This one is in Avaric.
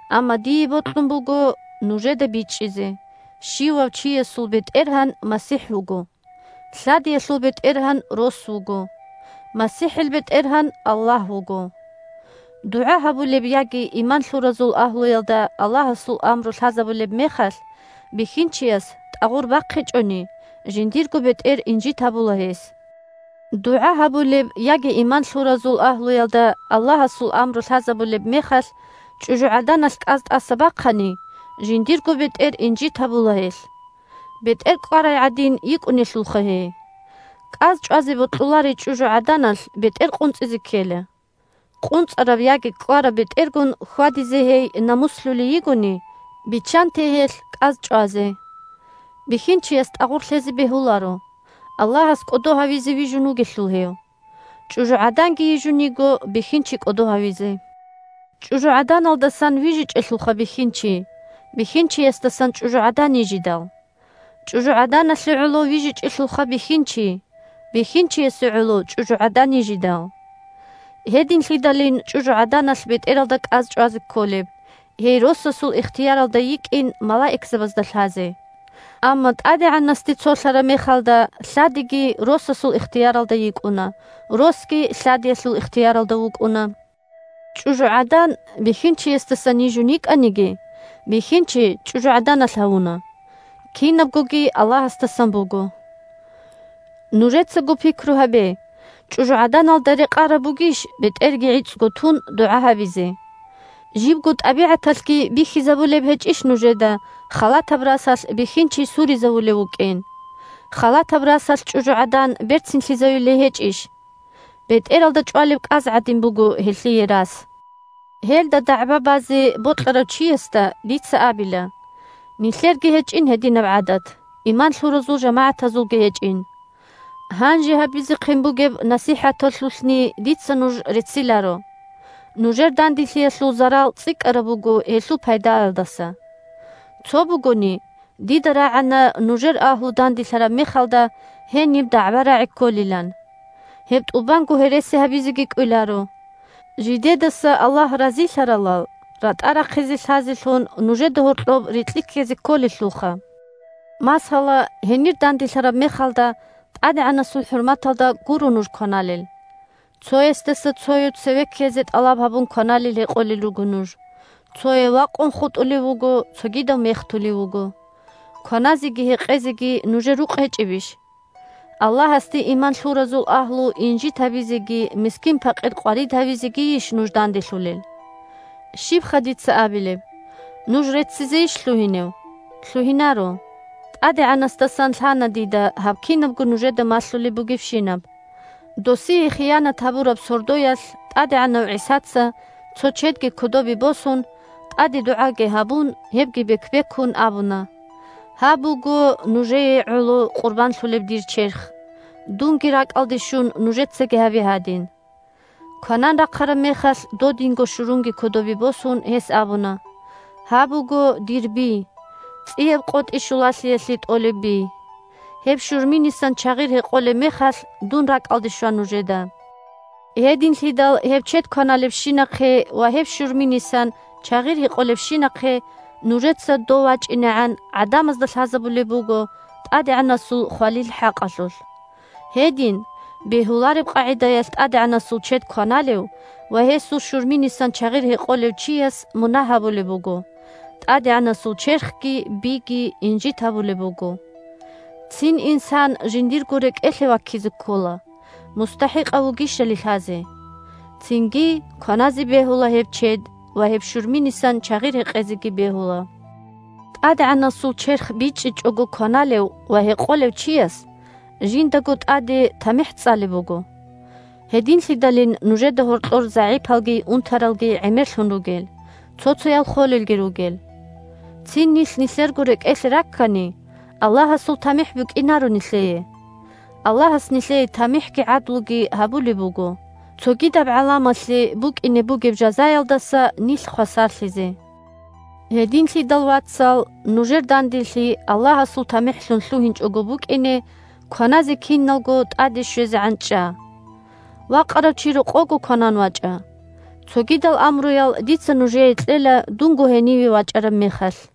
Амма дие бокьун буго нужеда бичӀчӀизе: щивав чиясул бетӀергьан МасихӀ вуго, лъадиялъул бетӀергьан рос вуго, МасихӀил бетӀергьан Аллагь вуго. ДугӀа гьабулеб яги иман лъуразул агьлуялда Аллагьасул амру лъазабулеб мехалъ бихьинчияс тӀагъур бахъичӀони, жиндирго бетӀер инжит гьабула гьес. ДугӀа гьабулеб яги иман лъуразул агьлуялда Аллагьасул амру лъазабулеб мехалъ чӀужугӀаданалъ кӀаз тӀаса бахъани, жиндирго бетӀер инжит гьабула гьелъ. БетӀер кӀкӀварай гӀадин йикӀунелъулха гьей. КӀаз чӀвазе бокьуларей чӀужугӀаданалъ бетӀер къунцӀизе ккела. КъунцӀараб яги кӀкӀвараб бетӀергун хьвадизе гьей намуслъулей йигони, биччанте гьелъ кӀаз чӀвазе. Бихьинчияс тӀагъур лъезе бегьуларо, Аллагьас кӀодо гьавизе вижун вугелъул гьев. ЧӀужугӀаданги йижун йиго бихьинчи кӀодо гьавизе. ЧӀужугӀаданалдасан вижичӀелъулха бихьинчи, бихьинчиясдасан чӀужугӀадан йижидал. ЧӀужугӀаданалъе гӀоло вижичӀелъулха бихьинчи, бихьинчиясе гӀоло чӀужугӀадан йижидал. Гьединлъидалин чӀужугӀаданалъ бетӀералда кӀаз чӀвазе кколеб, гьей росасул ихтияралда йикӀин малаикзабазда лъазе. Амма ТӀадегӀанасде цолъараб мехалда лъадиги росасул ихтияралда йикӀуна, росги лъадиялъул ихтияралда вукӀуна. ЧӀужугӀадан бихьинчиясдасан йижун йикӀаниги, бихьинчи чӀужугӀаданалъ гьавуна. Кинабгоги Аллагьасдасан буго! Нужецаго пикру гьабе, чӀужугӀаданалда рекъараб бугищ бетӀерги гӀицӀго тун дугӀа гьабизе? Жибго тӀабигӀаталъги бихьизабулеб гьечӀищ нужеда халатаб расалъ бихьинчи суризавулев вукӀин? Халатаб расалъ чӀужугӀадан берцинлъизаюлей гьечӀищ? БетӀералда чӀвалеб кӀаз гӀадин буго гьелъие рас. Гьелда дагӀба базе бокьарав чиясда дица абила, нилъерги гьечӀин гьединаб гӀадат, иман лъуразул жамагӀатазулги гьечӀин. Гьанже гьабизехъин бугеб насихӀаталъулъни дица нуж рецциларо: нужер данделъиялъул зарал цӀикӀкӀараб буго гьелъул пайдаялдаса. Цо бугони, дида рагӀана нужер агьлу данделъараб мехалда гьениб дагӀба-рагӀи кколилан. Гьеб тӀубанго гьереси гьабизеги кӀвеларо. Жидедаса Аллагь разилъаралал ратӀа рахъизе лъазелъун нужеда гьоркьоб рикьи ккезе кколелъулха. Масала, гьенир данделъараб мехалда ТӀадегӀанасул хӀурматалда гуро нуж кваналел. Цоясдаса цояв цеве ккезе тӀалаб гьабун кваналел-гьекъолел руго нуж – цояв вакъун хутӀулев вуго, цогидав мехтулев вуго. Кваназеги гьекъезеги нужер рукъ гьечӀебищ? Аллагьасде иман лъуразул агьлу инжит гьабизеги мискин-пакъир къварид гьавизегийищ нуж данделъулел? Щибха дица абилеб? Нуж реццизейищ лъугьинев? Лъугьинаро! ТӀадегӀанасдасан лъана дида гьаб кинабго нужеда малъулеб бугебщинаб. Досие хиянат гьабураб сордоялъ ТӀадегӀанав ГӀисаца, цо чедги кодобе босун, тӀаде дугӀаги гьабун, гьебги бек-бекун абуна: «Гьаб буго нужее гӀоло къурбанлъулеб дир черх. Дунги ракӀалде щун, нужецаги гьабе гьадин». Кванан рахъараб мехалъ, додинго щурунги кодобе босун, гьес абуна: «Гьаб буго дир би – ЦӀияб КъотӀи щулалъиялъе тӀолеб би. Гьеб щурминисан чагъир гьекъолеб мехалъ, дун ракӀалде щва нужеда». Гьединлъидал гьеб чед кваналебщинахъе ва гьеб щурминисан чагъир гьекъолебщинахъе нужеца, Дов вачӀинегӀан, гӀадамазда лъазабулеб буго ТӀадегӀанасул хвалил хӀакъалъулъ. Гьедин, бегьулареб къагӀидаялъ ТӀадегӀанасул чед кваналев ва гьесул щурминисан чагъир гьекъолев чияс мунагь гьабулеб буго – ТӀадегӀанасул черхги биги инжит гьабулеб буго. Цин инсан жиндирго рекӀелъе ваккизе ккола, мустахӀикъав вугищали лъазе. Цинги кваназе бегьула гьеб чед ва гьеб щурминисан чагъир гьекъезеги бегьула. ТӀадегӀанасул черх бичӀчӀичӀого кваналев ва гьекъолев чияс жиндаго тӀаде тамихӀ цӀалеб буго. Гьединлъидалин нужеда гьоркьор загӀипалги унтаралги гӀемерлъун ругел, цо-цоял холелги ругел. Цин нилъ нилъерго рекӀелъе раккани, Аллагьасул тамихӀ букӀинаро нилъее. Аллагьас нилъее тамихӀги гӀадлуги гьабулеб буго, – цогидаб гӀаламалъе букӀине бугеб жазаялдаса нилъ хвасарлъизе. Гьединлъидал, вацал, нужер данделъи Аллагьасул тамихӀлъун лъугьинчӀого букӀине, кваназе киналго тӀаде щвезегӀан чӀа. Вакъарав чи рокъовго кванан вачӀа. Цогидал амруял дица нужее кьела дунго гьениве вачӀараб мехалъ.